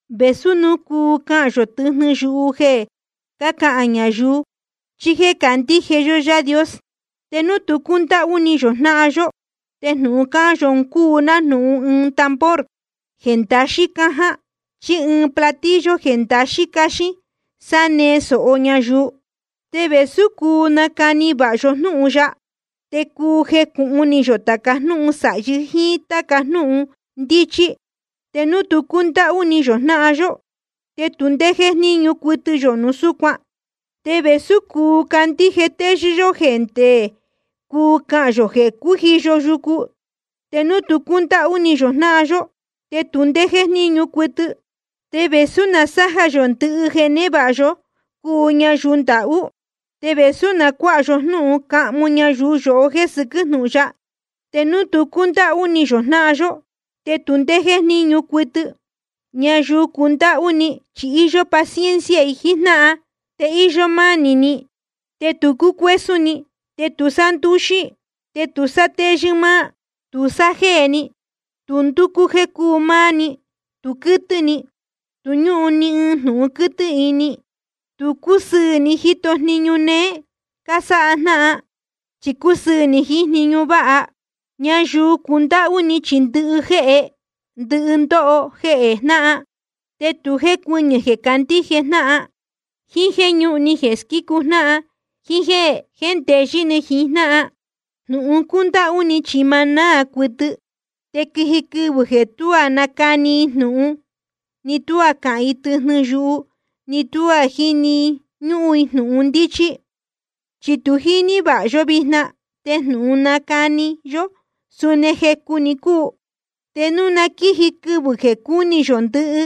Vēsú núu cuu cahān yō tɨjnɨ yuhu jeē cácahān ñayuu chí jéē cácahān ndajéhé Yaā Dios, te núu tu cúndáhú ni yō jnáhan yó, te jnūhun cahān yō un cúu nájnūhun ɨɨn tambor jeē ndaxín cáján chí ɨɨn platillo jeē ndaxín cáxín sánee sōho ñayuu. Te vēsú cuu nacani vāha yó jnúhun ya, te cuu jecūhun ni yō tāca jnúhun sāhi yá jiín táca jnúhun ndíchí, te núu tu cúndáhú ni yō jnáhan yó, te tu ndé jéjníñu cuɨtɨ yō núu súcuan. Te vēsú cuu candíje téyɨ́ yó jeē nde cuu cahān yō jeē cújiyo yucu, te núu tu cúndáhú ni yō jnáhan yó, te tu ndé jéjníñu cuɨtɨ. Te vēsú na sája yó ndɨhɨ jeē névāha yó cuu ñayuu ndahú, te vēsú núu cuāha yó jnúhun cahmu ñayuu yohó jéē sɨquɨ́ jnúhun ya, te núu tu cúndáhú ni yō jnáhan yó, te tu ndé jéjníñu cuɨtɨ. Ñayuu cundáhú ni chi íyó paciencia jiín jnáhan, te íyó mánī ni, te tu cúcuésún ni. Te tu sándúxí, te tu sátéyɨ́ máá. Tu sájéē ni, tu ndúcú jéē cúu máá‑ni, tu quɨ́tɨ́ ni, tu ñúhun ni jnūhun quɨ́tɨ́ ni. Tu cúsɨɨ̄ ni jíto jniñu néé cásáha jnáhan, chi sa cúsɨɨ̄ ni jiín jniñu váha. Ñayuu cundáhú ni chi ndɨhɨ jéhnde ni ndoho jehē jnáhan, te tu jécuɨñɨ̄ jeē candíje jnáhan, jíín jéē ñúhun ni jeē squícu jnáhan, jíín jéē jéndeyɨ́ ni jiín jnáhan. Jnūhun cúndáhú ni chi ma náā cuɨtɨ. Te quiji quɨvɨ̄ jeē tuá nacani i jnūhun, ni tuá cahān i tɨjnɨ yuhu, ni tuá jíni ñúhún jnūhun ndíchí. Chi tu jíní vāha vāha yó vijna, te jnūhun cánacani yó suni jecu‑ni cúu. Te núu na quíji quɨvɨ̄ jeē cúni yō ndɨhɨ,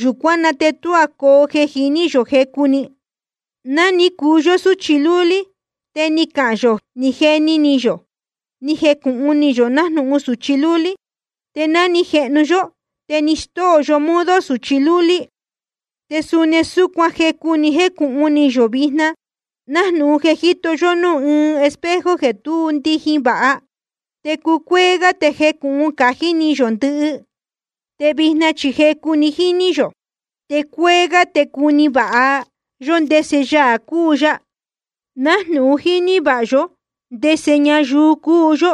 yūcuán na te tuá coo jeē jiní yō jecu‑ni. Ná ni cuu yó súchi lúlí te ni cahān yō, ni jeni ni yō, ni jecūhun ni yō nájnūhun sūchi lúlí. Te ná ni jehnu yó te ni stóo yó modo sūchi lúlí. Te suni súcuan, jecu‑ni jécūhun ni yō vijna, nájnūhun jeē jíto yó núū ɨɨn espejo jeē tú ndijin vāha. Te cúcuéé gá te jecūhun cájí ni yō ndɨhɨ. Te vijna chi jecu‑ni jíní yō, te cúcuéé gá te cuni vāha yó ndese Yaā cúu ya, nájnūhun jíní vāha ya yohó ndese ñayuu cúu yó.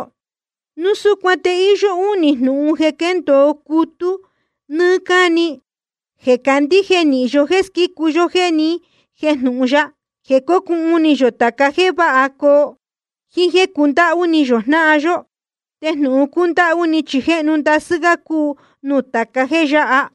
Núu súcuan te íyó únī jnūhun jeē quéndōo cutú nɨ́ɨ́ cáni: Jeē candíje nīhin yó jéē squícu ya jeē ni jéjnūhun ya, jeē cócuhun ni yō tāca jéē váha coo, jíín jéē cundáhú ni yō jnáhan yó. Te jnūhun cúndáhú ni chi jéhnu ndasɨ́ gá cúu nuū tāca jéē yáha.